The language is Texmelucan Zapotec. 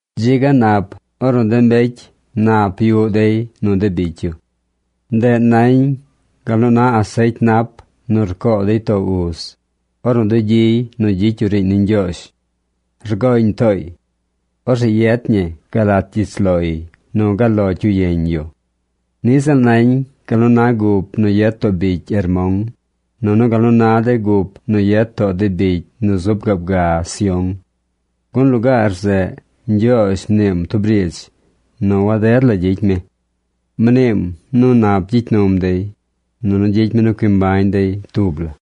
Dzi ga nap, ornu de mbecy nap yuꞌ dey nu de bicy yu. Ndeꞌ nañ gal nu na asecy nap nu rcoo dey too uz, ornu dugyiy nu gyicy yu riiñ ni Ñgyoozh. Rgoñ tooy. Orzeꞌ yet ñi gal lat gyich loy nu gal lo cyu yeñ yu. Niꞌ ziꞌl nañ gal nu na gup nu yet too bicy Hermon, nunu gal nu na de gup nu yet too de bicy nu zub gaab ga Sión. Gun lugaar zeꞌ Ñgyoozh mniim tub riidz nu waded la gyicy mi. Mniim nu nap gyicy num dey, nunu gyicy mi nu cui mbañ dey tub la.